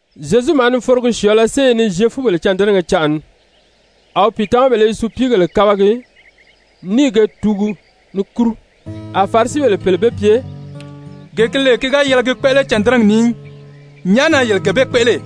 Zyezu maa ni forogi syɔ̀ɔ̄lɔ séye ni Zyefubèle cândɛnɛgɛ canʔa ni. A wi pìitamabèle i supiigèle kabagi ní i ge tuugu ni kúru. A Farisibèle pèle be pye: «Gee gi lè ki ga yɛlɛ gi kpéʔele cândɛnɛgi ni í, nyàʔá na yele gee bee kpéʔele?»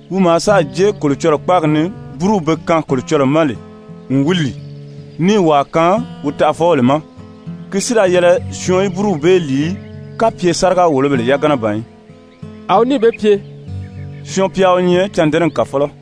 Wi maa sáà jée Kolocɔlɔɔ kpáagi ni búruw be kaan Kolocɔlɔɔ ma n wi lìi, níì wàa kaan wi taʔafɔbèle ma, ki si da yɛlɛ syɔɔn í búruw bee lìi í, kapye sáriga-wòlobèle yagana ban í.» A wi níì be pye: «Syɔɔn-pya wi nyɛ cândɛnɛgi kàfɔlɔ.»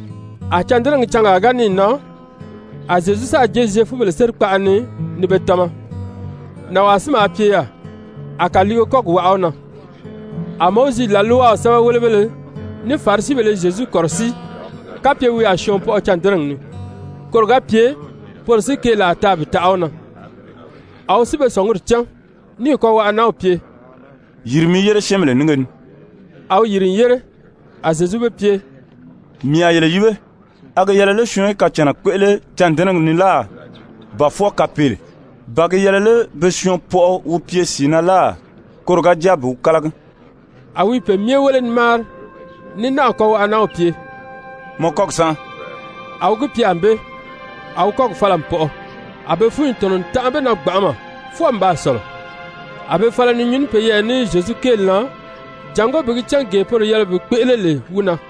A cândɛnɛgi cangaa ga níì nan, a Zyezu sáà jée Zyefubèle sérikpaʔa ni ni be tama. Nànwaa si maa pye yaà, a kàliige kɔ́gi waʔa wi na. A Mowizi làlwaw sɛ́bɛwelebéleFarisibèle i Zyezu kɔ̀rɔsíi kapye wi a syɔɔn pɔʔɔ cândɛnɛgi ni, koro ga pye poro si keelaa taa bi taʔa wi na. A wi si be sɔ̀nguri cán, níì kɔwaʔa-nanw pye: «Yiri mi yére syɛ́ɛnbèle nínge ni.» A wi yìri n yére. A Zyezu be pye: «Mii a yele yíbe, a gi yɛlɛ lé syɔɔn í kacànna kpéʔele cândɛnɛgi ni láà, ba fwɔɔ kapeele? Ba gi yɛlɛ lé be syɔɔn pɔʔɔ wi pye sìi na láà, koro ga jáa bi wi kálagi?» A wi i pe myɛ wéle ni máari, ní náà kɔwaʔa-nanw pye: «Mɔ kɔ́gi sánʔa.» A wi gi pye ànbée, a wi kɔ́gi fala n pɔʔɔ. A be fúnyi tɔ̀nɔ n tanʔa be na gbanʔama fwɔɔ n baa sɔ̀lɔ. A be fala ni nyuu ní peyɛɛ ní Zyezu kéeli na jàngó bi gi cán gee poro yɛlɛ bi kpéʔele lè wi na.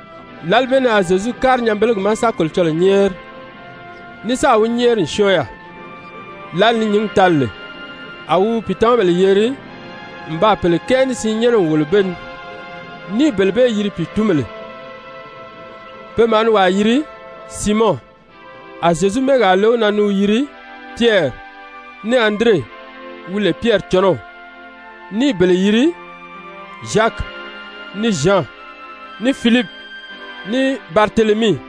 Lǎli bee ni a Zyezu kári nyanbelegi ma sa Kolocɔlɔɔ nyɛ́ɛri, ní sáà wi nyɛ́ɛri n syɔ́ɔn yaà. Lǎli ni nyǐngi tali lè, a wi wi pìitamabèle yeri n baa pèle kɛɛ ní siin nyɛ́nɛ n wòlo be ni, ní i bele bee yiri pìitunbèle. Pe maa ni wàa yiri Siimɔn, a Zyezu mɛ́ɛgaa le wi na ni wi yiri Pyɛri, ní Andire wi lè Pyɛri cɔnɔw, ní i bele yiri Zyaki, ní Zyan, ní Filipi, ní Baritelemii,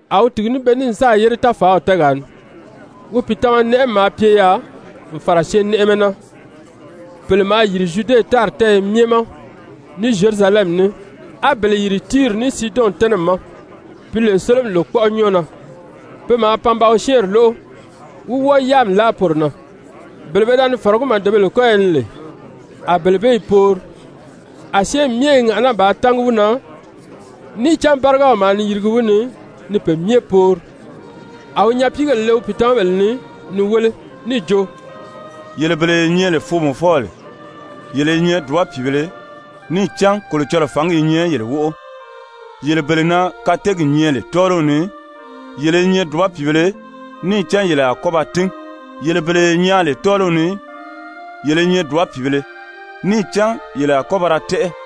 A wi tìgi ní be ní n sáà yére táfàaw tɛ́ɛgaa ni, wi pìitama-nɛʔɛmi maa pye yaà n fàra syɛɛnnɛʔɛmɛ na, pèle maa yìri Zyude tári tɛ́ɛyɛ myɛ ma ní Zyerusalɛmi ní, á bele yìri Tiiri ní Siidɔn tɛ́nɛmi ma, pi lè sólomi lòkpɔʔɔ nyɔ́ɔ na. Pe maa pan ba wi syɛ́ɛnri lóʔo, wí wɔ́ɔ yáami láʔa poro na. Bele pe da ni fɔ̀rɔgí màdebèle kɔ́yɔ ni lè, a bele bee i poori. A syɛ́ɛnmi myɛ i ŋàʔaná bàā tángi wi na, níì cán bárigaw maa ni yirigi wi ni ni pe myɛ poori. A wi nyapiigèle le wi pìitamabèle ni ni wéle níì jo: «Yele bele ye nyɛ lè foomɔfɔbèle, yele i nyɛ dùba pìibēle, níì cán Kolocɔlɔɔ fǎngi i nyɛ yele wóʔo! Yele bele na kateegi nyɛ lè tɔ́ɔliw ni, yele i nyɛ dùba pìibēle, níì cán yele a kɔ́ ba tín! Yele bele ye nyaan lè tɔ́ɔliw ni, yele i nyɛ dùba pìibēle, níì cán yele a kɔ́ ba ra tɛ́ʔɛ!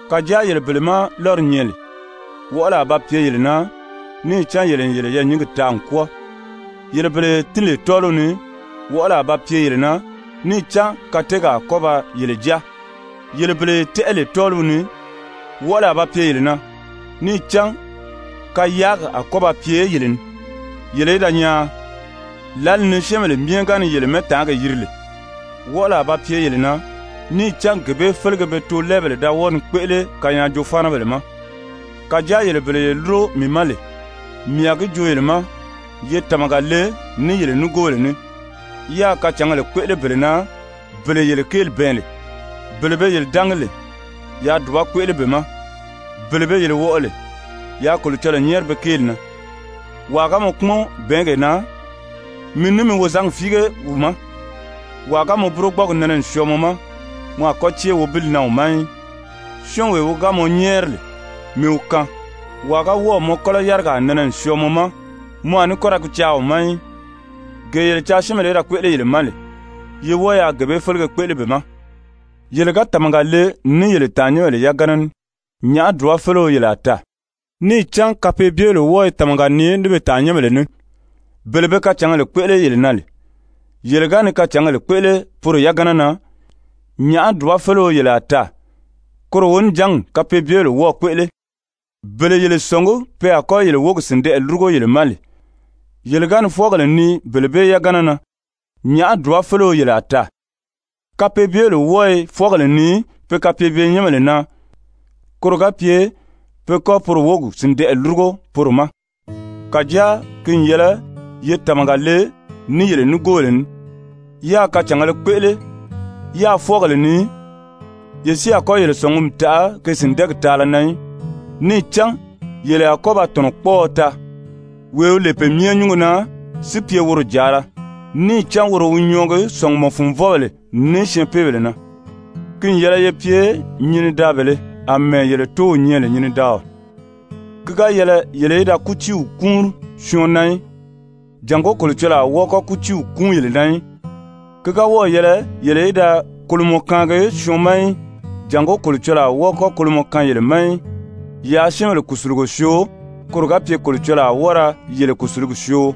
Kàjáa yele bele má lɔ́ri nyɛ lè, wɔʔɔli a ba pye yele na, níì cán yele n yele yɛɛ̀nyingi taa n kwɔ́ɔ. Yele bele ye tín lè tɔ́ɔliw ni, wɔʔɔli a ba pye yele na, níì cán kateegi a kɔ́ ba yele jáa! Yele bele ye tɛ́ʔɛ lè tɔ́ɔliw ni, wɔʔɔli a ba pye yele na, níì cán kayaagi a kɔ́ ba pye yele ni, yele í da nyaan! Lǎli ni syɛ́ɛnbèle myɛ ga ni yele mɛ́ɛtaangi yiri lè, wɔʔɔli a ba pye yele na, níì cán gee bee félege be toolɛɛbèle da wɔ́ɔ ni kpéʔele kanyaajoo-fáanabèle ma. «Kàjáa yele bele ye lúro mii ma lè, mii a gi joo yele ma: Ye tàmaga le ní yele nigoobèle ní, yáā kacǎngèle kpéʔele bele na bele yele kéeli bɛɛn lè. Bele be yele dángi lè, yaa dùba kpéʔele be ma, bele be yele wɔʔɔ lè, yaa Kolocɔlɔɔ nyɛ́ɛri be kéeli na. Wàa ga mɔ kpúmɔn bɛ̀ɛ́ngee na, mi ní mi wozangi fíige wi ma. Wàa ga mɔ burogbɔɔgi nɛnɛ n syɔɔ mɔ ma, mɔ a kɔ́ cée wobili na wi ma í. Syɔ́ɔnwee wi ga mɔ nyɛ́ɛri lè, mi wi kaan, wàa ga wɔ́ɔ̀ mɔ kɔ́lɔ yarigaa nɛnɛ n syɔɔ mɔ ma, mɔ a ní kɔ́ ra gi caa wi ma í. Gee yele caa syɛ́ɛnbèle í da kpéʔele yele ma lè, ye wɔ́ɔ yaa gee bee félege kpéʔele be ma. Yele ga tàmaga le ní yele tàannyɛnbèle yagana ní, nyàʔá dùbafeleo yele a taa? Níì cán kapeebyebèle wɔ́ɔ i tàmaga nii ní be tàannyɛnbèle ní. Bele be kacǎngèle kpéʔele yele na lè, yele ga ni kacǎngèle kpéʔele poro yagana na, nyàʔá dùbafeleo yele a taa? Koro wonijangi kapeebyebèle wɔ́ɔ̄ kpéʔele. Bele yele sɔ̀ngí pe a kɔ́ yele wógi sìndɛʔɛ lúrugo yele ma lè, yele ga ni fwɔ́ɔgèle nii bele bee yagana na, nyàʔá dùbafeleo yele a taa? Kapeebyebèle wɔ́ɔ i fwɔ́ɔgèle nii pe kapeebye-nyɛ́nbèle na, koro ga pye pe kɔ́ poro wógi sìndɛʔɛ lúrugo poro ma. Kàjáa ki n yɛlɛ ye tàmaga le ní yele nigoobèle ní, yáā kacàngēle kpéʔele, yáā fwɔ́ɔgèle nii, ye si a kɔ́ yele sɔ̀ngumi taʔa ge sìndɛɛgi taala na í. Níì cán yele a kɔ́ ba tɔ̀nɔkpɔɔɔ taa, wee wi lè Pe Myɛ Nyúngo na si pye woro jàala, níì cán woro wi nyɔɔgi sɔ̀ngumɔ-fùnvɔbèle ní syɛɛnpeebèle na. Ki n yɛlɛ ye pye nyinidaabèlē àmɛɛ yele Tóow nyɛ lè nyinidaaɔ.» «Ki ga yɛlɛ yele í da kútiiw kúunri syɔɔn na í, jàngó Kolocɔlɔɔ a wɔ́ɔ kɔ́ kútiiw kúun yele na í, ki ga wɔ́ɔ̀ yɛlɛ yele í da kolomɔ kaangi syɔɔn ma í, jàngó Kolocɔlɔɔ a wɔ́ɔ kɔ́ kolomɔ kaan yele ma í, yaa syɛ́ɛnbèle kùsulugo syoo, koro ga pye Kolocɔlɔɔ a wɔ́ɔ ra yele kùsulugi syoo.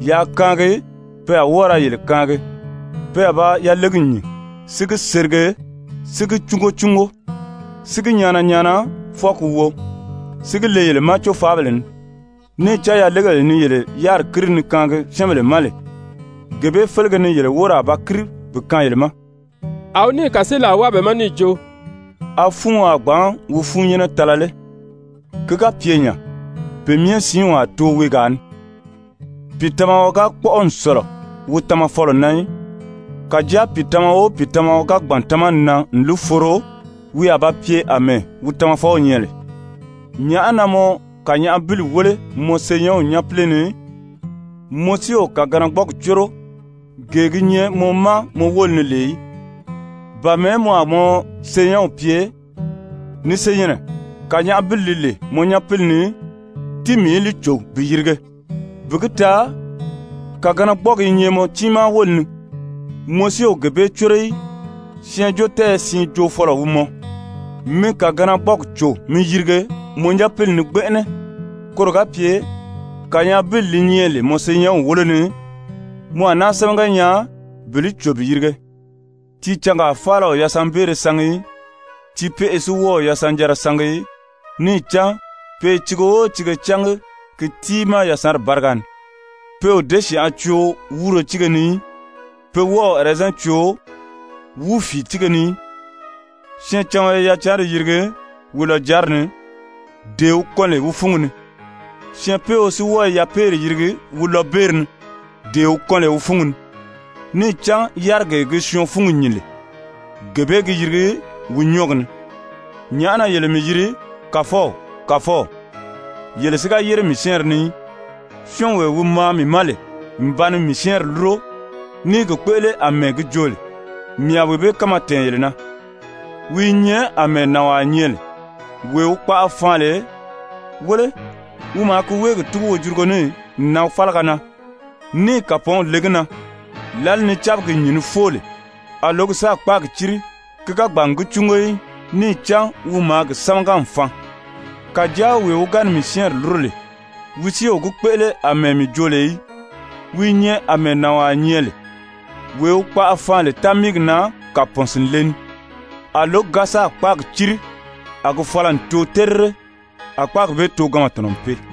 Yaa kaangi, pe a wɔ́ɔ ra yele kaangi, pe a ba yalegi nyìn, si gi serige, si gi cúngo cúngo, si gi nyaana nyaana, fwɔɔ ki wo, si gi le yele ma cófaabèle ni. Níì cán yalegee ni yele yáriri kíri ni kaangi syɛ́ɛnbèle ma lè, gee bee félege ni yele wóri a ba kíri bi kaan yele ma.» A wi níì kàseelaa wáa be ma níì jo: «A fúuɔn a gbǎn wi fúunnyɛnnɛ tala lé? Ki ga pye nya, pe myɛ siinw a too weegaa ni ì? Pìitamaɔ ga kpɔ́ʔɔ n sɔ̀lɔ wi tamafɔlɔ na í. Kàjáa pìitamaɔ o pìitamaɔ ga gbàn tamani na n li foro, wi a ba pye àmɛɛ wi tamafɔw nyɛ lè. Nyàʔá na mɔ kànyaʔabili wéle mɔ senyɛnw nyápile ni, mɔ si o kàganagbɔɔgi córo, gee gi nyɛ mɔ ma mɔ wóli ni lè í? Ba mɛ̀ɛ́ mɔ a mɔ senyɛnw pye: Ni senyɛnnɛ, kànyaʔabili li lè mɔ nyapili ni, tíi mii í li cò bi yirige, bi gi taa kàganagbɔɔgi i nyɛ mɔ tiimaa wóli ni, mɔ si o gee bee córo í? Syɛɛnjóotɛɛyɛ siin joofɔlɔ wi mɔ. Mi kàganagbɔɔgi cò mi yirige mɔ nyapili ni gbɛnʔɛnɛ, koro ga pye kànyaʔabili li nyɛ lè mɔ senyɛnw wólo ni, mɔ a náa sámaga nyaa bi li cò bi yirige. «Tiicangaa faala o yasanbeere sangi í, tiipeʔe si wɔ́ɔ o yasanjanra sangi í. Níì cán pe i tiige o tiige cángi gi tiimaa yasanri báriga ni. Pe o děsyanʔa coo wúuro tíige ni í, pe wɔ́ɔ o ɛrɛzɛn coo wúufiitiige ni í. Syɛɛncaɔn i yacanri yirigi wi lɔjanri ni, dee wi kɔn lè wi fúngi ni, syɛɛnpeeo si wɔ́ɔ i yapeeri yirigi wi lɔbeeri ni, dee wi kɔn lè wi fúngi ni. Níì cán yárigee gi syɔɔn fúngi nyìn lè, gee bee gi yirigi wi nyɔ́ɔgi ni. «Nyàʔá na yele mii yiri, ‹Kàfɔw, Kàfɔw,› yele si ga yére mii syɛ́ɛnri ni í? Syɔ́ɔnwee wi maa mii ma lè n ba ni mii syɛ́ɛnri lúro ní i gi kpéʔele àmɛɛ mii jo lè, mii a wee bee kánma tɛ̀ɛn yele na. Wi i nyɛ àmɛɛ nànwaa nyɛ lè wee wi kpaʔa faan lè. Wéle wi maa ki wéegi túgu wojurugo ní n nan fálaga na, níì kàpɔɔnw le gi na. Lǎli ni cábigi nyìn ni fóo lè, a lǒgi sáà kpáagi círi, ki ga gbàn n gi cúngo í. Níì cán wi maa gi sámaga n faan. Kàjáa wee wi ga ni mii syɛ́ɛnri lúro lè, wi si o gi kpéʔele àmɛɛ mii jo lè í, wi i nyɛ àmɛɛ nànwaa nyɛ lè wee wi kpaʔa faan lè támiigi na kàpɔɔn sìnle ni. A lǒgi ga sáà kpáagi círi, a gi fala n too terire, a kpáagi bee tooganma tɔ̀nɔ n pee.»